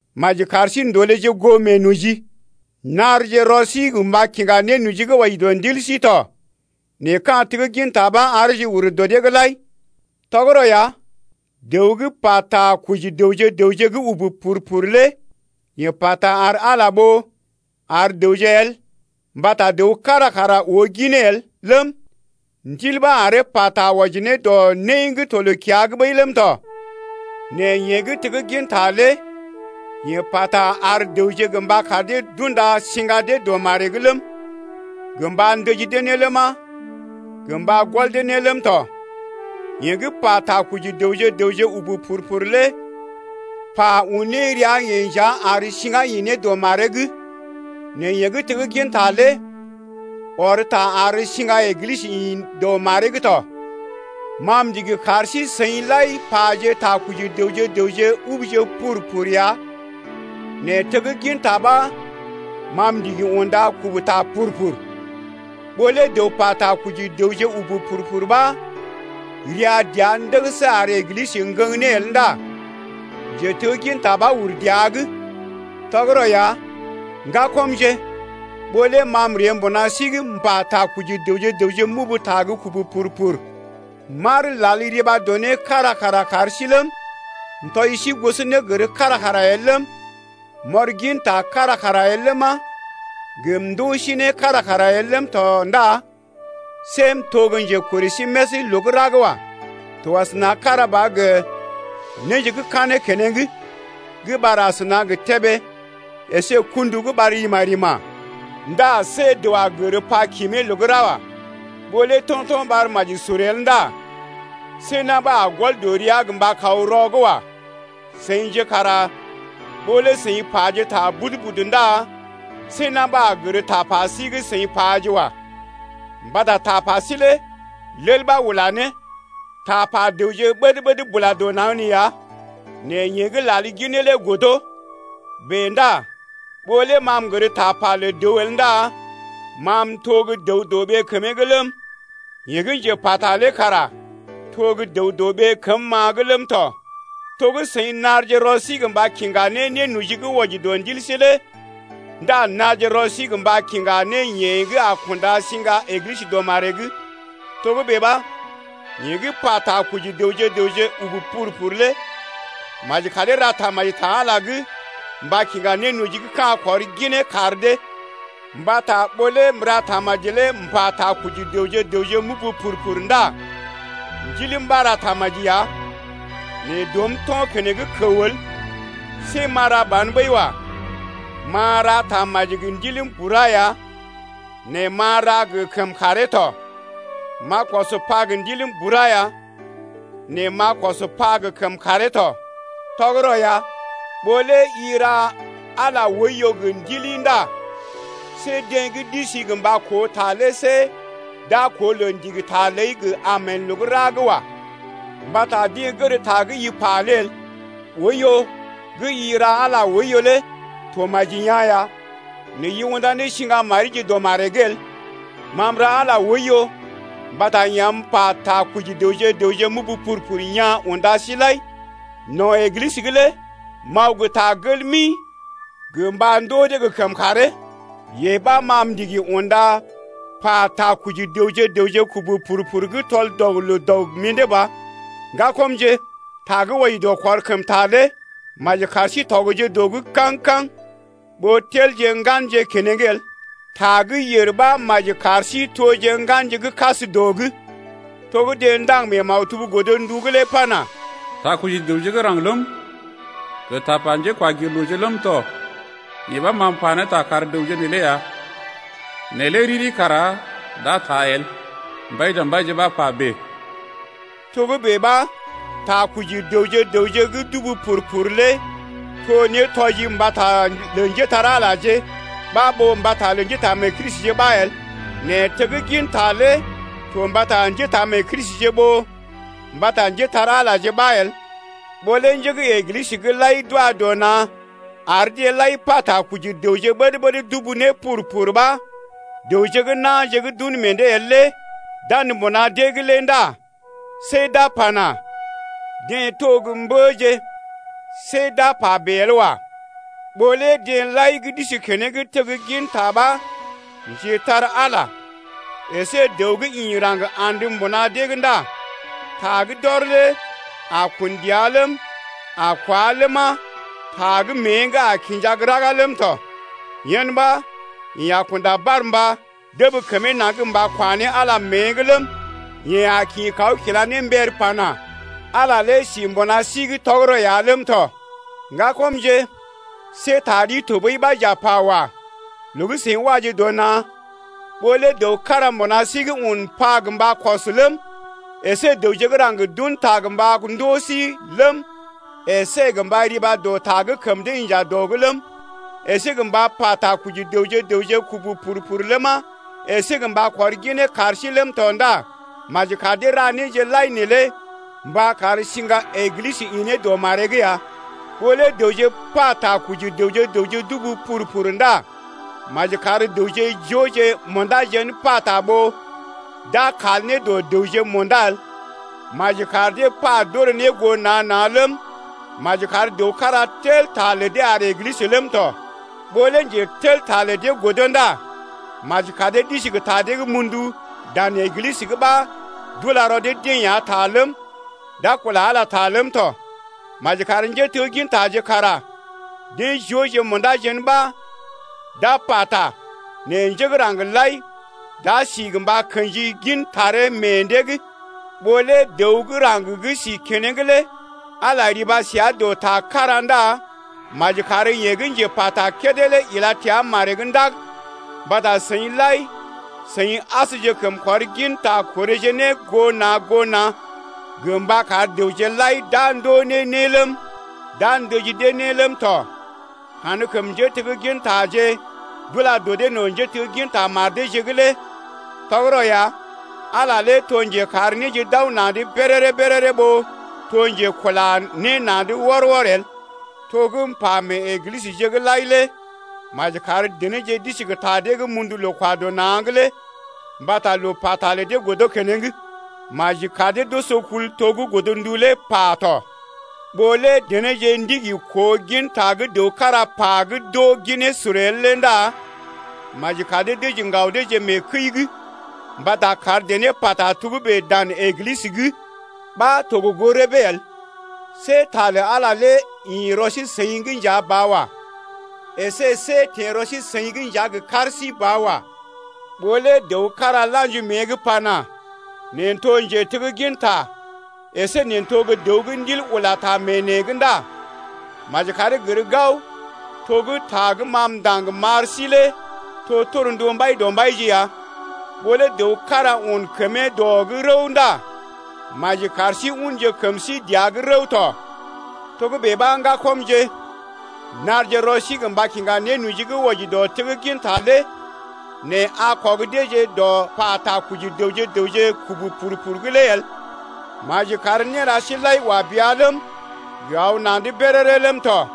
Maji kar sí ndolèje goo meenoji. Narje rɔ sí gə mba kiŋga nénoji gə́ wɔji dɔ ndil sí tɔ nɛ ka̰ tegginta ɓa areeje ur dɔ dee’g lai. Tɔgərɔ ya, dəw gə́ pa takɔji dəwje-dəwje gə́ ubu pur-pur lé yeḛ pata ar Ala ɓó ar dəwje el mbata dəw kára kara oo ginee el ləm, Ndil ɓa aree pata wɔji ne dɔ né gə́ to loo-kiya’g ɓəi ləm tɔ. Nɛ yeḛ gə́ tegginta lé yeḛ pata ar dəwje gə mba kar dee d’unda siŋga dee dɔ maree’g ləm, gə mba ndəji dee ne ləma, gə mba gɔl dee ne ləm tɔ. Yeḛ gə́ pa takɔji dəwje-dəwje ubu pur-pur lé pa un ne rəa-yeḛ nja ar siŋgá ḭ ne dɔ maree’g nɛ yeḛ gə́ tegginta lé ɔr ta ar siŋga Eglisə ḭ dɔ maree’g tɔ. Ma m’ndigi kar sí-seḭ lai paje takɔji dəwje-dəwje ubuje pur-pur ya nɛ tegginta ɓa ma m’ndigi unda kubu ta pur-pur. Ɓó lé dəw pata koji dəwje ubu pur-pur ɓa ria dəa ndəgəsə ar Eglisə ŋgəŋ ne el ndá njetegginta ɓa uru dəa’g. Tɔgərɔ ya, ŋgakɔmje, ɓó lé ma m’ree mbuna sí’g m’pa takɔji dəwje-dəwje m’ubu ta gə́ kubu pur-pur m’lal riba dɔ né kára kara kar sí ləm, m’tɔji sí gosonégər kára kara el ləm, m’ɔr ginta kára kara el ləma, gə m’ndoo sí né kára kara el ləm tɔ ndá see m’to gə́ njekorè sí més loo gə́ ra’g wa. To kára ba asəna gə néje gə́ kanee keneŋ gə́ ɓar asəna gə tébé əsé gə kṵdu gə́ ɓar rima-rima ndá see dəw a gər pa kimee loo gə́ ra wa. Ɓó lé to̰to̰ ɓar maji sur el ndá see na̰ ɓa a gɔl dɔ rəa gə mba kaw rɔ’g wa. Seḭje kara ɓó lé seḭ paje ta budu-budu ndá see na̰ ɓa a gər tapa sí gə́ seḭ paje lé wa. Mbata tapa sí lé lel ɓa ula ne. Tapa dəwje ɓəd-ɓəd bula dɔ naŋg nee ya nɛ yeḛ gə́ lal ginee lé godo. Bèe ndá ɓó lé ma m’gər tapa lə dəw el ndá ma m’to gə́ dəw-dɔ-ɓee kəmee’g ləm, yeḛ gə́ njepata lé kara to gə́ dəw gə́ dəw-dɔ-ɓee kəm-ma’g ləm tɔ. To gə́ seḭ narje rɔ sí gə mba kiŋga ne nénoji gə́ wɔji dɔ ndil sí lé ndá narje rɔ sí gə mba kiŋga ne yeḛ gə́ a kunda siŋga Eglisə dɔ maree’g tɔ. Togə́bè ɓa, yeḛ gə́ pa takɔji dəwje-dəwje ubu pur-pur lé maji karee ra tamaji ta Ala’g mba kiŋga nénoji gə́ ka̰ kɔr ne ginee kar dee. Mbata ɓó lé m’ra tamaji lé m’pata koji dəwje-dəwje m’ubu pur-pur ndá ndiləm ɓa ra tamaji ya nɛ dɔm to̰ keneŋ kəw el. See m’a ra ban ɓəi wa. M’a ra tamaji gə ndiləm bura ya nɛ m’a ra gə kəmkàree tɔ. M’a kɔs pa gə ndiləm bura ya nɛ m’a kɔs pa gə kəmkàree tɔ. Tɔgərɔ ya, ɓó lé i ra Ala oiyo gə ndili ndá see deḛ gə́ d’isi gə mba koo ta lé see d’a koo loo ndigi ta ləi gə Amen loo gə́ ra’g wa. Mbata deḛ gər ta gə́ i pa lé el. Oiyo gə́ i ra Ala lé to maji yaa̰ ya nɛ i unda ne siŋga marije dɔ maree’g el. Ma m’ra Ala oiyo mbata yeḛ am m’pa takɔji dəwje-dəwje m’ubu pur-pur yaa̰ unda sí lai ya. No̰ Eglisə’g lé m’aw gə ta gel mi gə mba ndoo dee gə kəmkàree, yee ɓa ma m’ndigi unda pa takɔji dəwje-dəwje kubu pur-pur gə́ tɔl-dɔg-loo-dɔg gə mḭdé ba. Ŋgakɔmje, ta gə́ wɔji dɔ kɔr kəm ta lé maji kar sí tɔgje dɔ’g kaŋ-kaŋ ɓó telje ŋganje keneŋ el. Ta gə́ yèr ɓa maji kar sí toje ŋganje gə́ kas dɔ’g. To gə́ deḛ ndaŋg mee maktub godndu’g lé pana: Takɔji dəwje gə́ raŋg ləm, gə tapa njékwagirlooje ləm tɔ, Yee ɓa m’a pa ne ta kar dəwje neelé ya Nɛ lé riri kara d’a taa el. Mbaidɔmbaije ɓa pa bèe. Togə́bè ɓa, takɔji dəwje-dəwje gə́ d’ubu pur-pur lé to nétɔji mbata lə njépole-magəje ɓa ɓó mbata lə njétaamee-Kristije ɓa el. Nɛ tegginta lé to mbata njétaamee-Kristije ɓó mbata njépole-magəje ɓa el. Ɓó lé njé gə́ Eglisə’g lai d’wa dɔ na̰ ar deḛ lai pa takɔji dəwje ɓəd-ɓəd d’ubu pur-pur ɓa dəwje gə́ na̰je gə́ d’un meḛ dee el lé d’andə mbuna dee’g lé ndá see d’a pana: Deḛ to gə́ mbəje, see d’a pa bèe el wa. Ɓó lé deḛ lai gə́ d’isi keneŋ tegginta ɓa njetar-Ala əsé dəw gə́ ḭ raŋg andə mbuna dee’g ndá ta gə́ d’ɔr lé a kun dəa ləm, a kwá ləma ta gə́ mée’g a kinja gə́ raga ləm tɔ. Yen ɓa yeḛ a kunda barmba dəb kəmee naŋg gə mba kwa ne Ala mée’g ləm, yeḛ a kḭ kaw kila ne mbər pana: Ala lé sí mbuna sí’g tɔgərɔ ya ləm tɔ. Ŋgakɔmje, see ta ɗi tɔɓəi ɓa j’a pa wa. Loo gə́ seḭ waje dɔ na̰, ɓó lé dəw kára mbuna sí’g un pa gə mba kɔs ləm, əsé dəwje gə́ raŋg d’un ta gə mba ndoo sí ləm, əsé gə mba riba dɔ ta gə́ kəm dee inja dɔ’g ləm, əsé gə mba pa takɔji dəwje-dəwje kubu pur-pur ləma, əsé gə mba kɔr ginee kar sí ləm tɔ ndá maji kar dee ra néje lai neelé mba kar siŋga Eglisə ḭ ne dɔ maree’g ya. Ɓó lé dəwje pa takɔji dəwje-dəwje d’ubu pur-pur ndá maji kar dəwje jooje munda jen pata ɓó d’a kal ne dɔ dəwje munda el. Maji kar dee pa d’orè ne goo na̰ na̰ ləm, maji kar dəw kára tel ta lə dee ar Eglisə ləm tɔ. Ɓó lé njetelta lə dee godo ndá maji kar dee d’isi gə ta dee mundu dan Eglisə’g ɓa d’ula rɔ dee-deḛ ya ta ləm, d’a kula Ala ləm tɔ. Maji kar njéteggintaje kara deḛ jooje munda jen ɓa d’a pata nɛ njé gə́ raŋg lai d’a si gə mba kḛji gin taree meḛ dee’g. Ɓó lé dəw gə́ raŋg gə́ si keneŋ lé Ala riba sə dɔ ta kára ndá maji kar yeḛ gə́ njepata kédé lé ila təa maree’g ndag. Mbata seḭ lai seḭ asjekəm kɔr ginta korèje ne goo na̰ goo na̰ gə mba kar dəwje lai d’a ndoo ne né ləm, d’a ndəji dee ne ləm tɔ. Kankəm njéteggintaje lé d’ula dɔ dee no̰ njétegginta mar deeje’g. Tɔgərɔ ya, Ala lé to njekar néje d’aw na̰’d béréré-béréré ɓó to njekula ne na̰’d wɔr-wɔr el. To gə́ m’pa mee Eglisəje lai lé maji kar denéje d’isi gə ta dee mundu loo-kwa-dɔ-na̰’g lé mbata loo pata lə dee godo keneŋ. Maji kar dee d’oso kul to gə́ godndu lé pa tɔ. Ɓó lé denéje ndigi koo ginta gə́ dəw kára pa gə́ d’oo ginee sur el lé ndá maji kar dee dəji ŋgaw deeje mee kəi’g, mbata kar dené pata togə́bè dan Eglisə’g ɓa to gə goo rəbee el. See ta lə Ala lé ḭ rɔ sí-seḭ’g nja ba wa. Esé see teḛ rɔ sí-seḭ’g nja gə kar sí ba wa. Ɓó lé dəw kára la̰ji mée’g pana: Neḛ n’to njetegginta əsé neḛ n’to gə́ dəw gə́ Ndil ula ta mee neḛ’g ndá maji karee gər gao to gə́ ta gə́ ma m’ndaŋg m’ar sí lé to torndu Mbaidɔmbaije ya. Ɓó lé dəw kára un kəmee dɔ’g rəw ndá maji kar sí unje kəm sí dəa’g rəw tɔ. Togə́bè ɓa, ŋgakɔmje, narje rɔ sí mba kiŋga nénoji gə́ wɔji dɔ tegginta lé nɛ a kɔg deeje dɔ pa takɔji dəwje-dəwje d’ubu pur-pur’g lé el. Maji kar néra sí lai wa bea ləm, gə aw na̰’d béréré ləm tɔ.